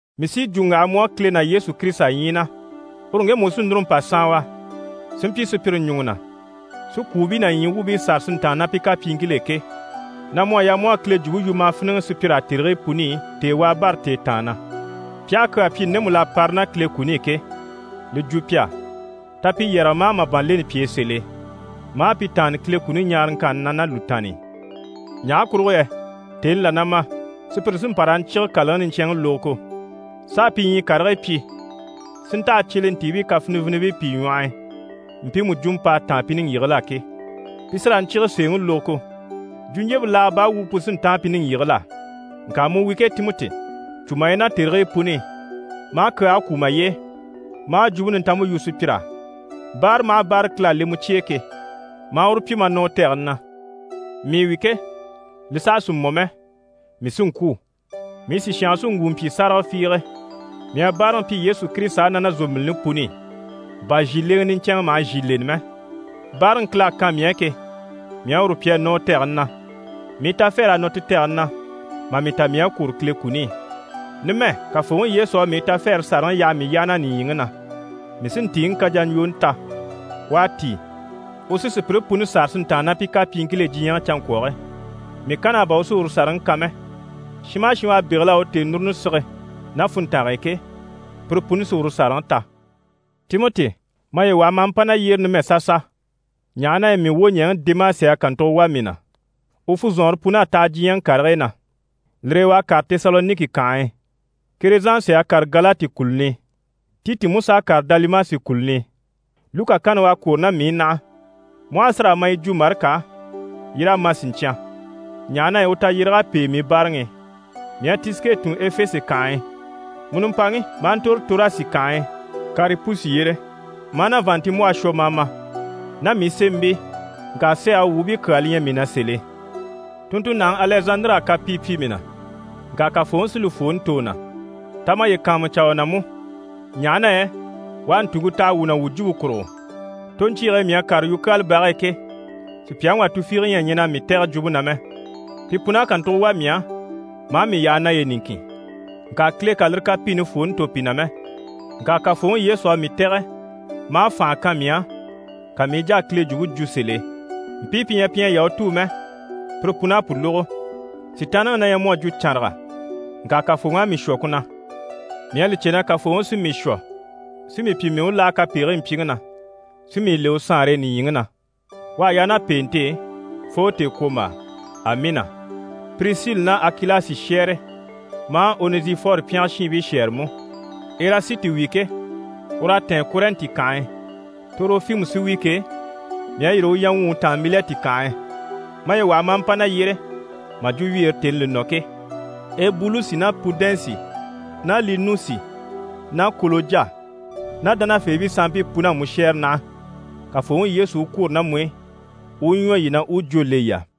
Mii sí yi jwo n‑waha mu á, Kile ná Yesu Kirisita ɲyii na, uru ŋgemu u sí núru n‑pa saanwa, si mpyi sùpyire ɲùŋɔ na, si kwùubii ná ɲyii wuubii sâra si ntàanna ná pi kapyiiŋkil'e ke, na mu à yaa mu u a Kile jwumpe yu ma a fíniŋɛ sùpyir'á tèrigii puni i, tèewaa bâra tèetaan na. Pi aha kyaa pyi ndemu l'à para ná Kile kuni i ke, li jwo pi á. Ta pi yɛrɛge ma a màban leni pi e sèl'e, ma a pi taanni Kile kuni ɲaaraŋkanni na ná lùtaanni i. Ɲaha kurugo yɛ tèni là na ma, sùpyire sí n‑pa raa ɲcyíge kàlaŋi niɲcɛnŋi lógogo, s'a pi ɲyii karigii pyi si ntaha cyelentiibii kafinivinibii pìi ɲwɔh'i mpiimu jwumɔ p'à táan pi niŋgyigigil'á ke. Pi sí raa ɲcyíge sèeŋi lógogo, jwuɲjyempe laaga baa wumpe pu sí n‑táan pi niŋgyigigil'á. Ŋka mu wi ke Timɔti, cû maye na tèrigii puni i, ma a kyaage kwú maye e, ma a Jwumpe Nintanmpe yu sùpyir'á. Báara maha báara Kile à le mu cye e ke, ma a uru pyi ma nɔ u tɛgɛni na. Mii wi ke, li saha sì mɔ mɛ, mii sí n‑kwû. Mii sìshange sí n‑wu n‑pyi sáraga fiige. Mii à báaraŋi pyi Yesu Kirisita á ná na zòmbilini puni i, bà zhìleŋɛ niɲcɛnŋɛ maha zhì leni mɛ. Báaraŋi Kile à kan mii á ke, mii à uru pyi a nɔ u tɛgɛni na. Mii tafɛɛr'à nɔ ti tɛgɛni na, mà mii ta mii à kwôro Kile kuni i. Numɛ Kafooŋi Yesu à mii tafɛɛre sàraŋi yaha mii yyaha na nìɲyiŋi na, mii sí ntìiŋi kajaɲjwooni ta. U à tíi, u sí sùpyire puni sâra sí n‑tàanna ná pi kapyiiŋkil'e diɲyɛŋi canŋkwɔge. Mii kann'á bà u sí uru sàraŋi kan mɛ, shin maha shin u à bégel'a u tèenuruni sige ná funntange e ke, pire puni sí uru sàraŋi ta. Timɔti, maye waha ma a mpa na yyére numɛ sasa, ɲaha na yɛ mii wwoɲɛɛŋi Demasi à kàntugo wà mii na, u funzɔnŋɔre pun'à taha diɲyɛŋi karigii na, lire e u à kàre Tesaloniki kànhe e. Kerezansi à kàre Galati kùluni i, Titi mú s'à kàre Dalimasi kùluni i. Luka kanni u à kwôro ná mii i naha. Mu aha a si raa ma, yi jwo Marika á yii raa ma siɲcyan, ɲaha na yɛ u tayyéreg'à pêe mii báaraŋi i. Mii à Tisike tun Efese kànhe e. Mu nimpaŋi, ma a ntòro Torasi kànhe e Karipusi yyére, ma a na vàanntinmbwɔhe shwɔ ma a ma, ná mii sémɛbii, ŋka sɛɛge wuubii kyaa li ɲyɛ mii na sèl'e. Tunntunnaŋi Alɛzandiri à kapii pyi mii na. Ŋka Kafooŋi sí li fwooni tò u na. Ta maye kàanmucaa u na mú, ɲaha na yɛ u à ntùŋke taha wuu na wuu jwumpe kurugo. Toɲcyiige e mii à kàre yukyaala bage e ke, sùpyaŋi wà tufiige ɲyɛ a ɲɛn'a mii tɛ̀gɛ jwumpe na mɛ. Pi pun'à kàntugo wà mii á, maa mii yaha naye niŋkin. Ŋka Kile kà lire kapiini fwooni tò pi na mɛ. Ŋka Kafooŋi Yesu à mii tɛ̀gɛ maa fànha kan mii á, ka mii i jà a Kile Jwumpe jwo sèl'e, mpii pi ɲyɛ pi ɲyɛ Yahutuu mɛ, pire pun'à pu lógo. Sitaanniŋi na ɲyɛ mu à jwo cànraga, ŋka Kafooŋi à mii shwɔ ku na. Mii à li cè na Kafooŋi sí mii shwɔ si mii pyi mii u láha kapegigii mpyiŋi na, si mii le u saanre e nìɲyiŋi na. U à yaa ná pèente e fo tèekwombaa. Amiina Pirisili ná Akilasi shɛ́ɛre ma a Onɛzifɔri pyɛngɛ shiinbii shɛ́ɛre mú. Erasiti wi ke, ur'à tɛ̀ɛn Kɔrɛnti kànhe e. Torofimu sí wi ke, mii à yîri u yaŋgwuŋi taan Milɛti kànhe e. Maye waha, ma a mpa na yyére mà jwo wyeere tèni li nɔ ke. Ebulusi ná Pudɛnsi ná Linusi ná Kolojya ná dánafeebii sanmpii pun'à mu shɛ́ɛre naha. Kafooŋi Yesu u kwôro ná mu i, u u ɲwɔ yii na, u u jwó le yii á.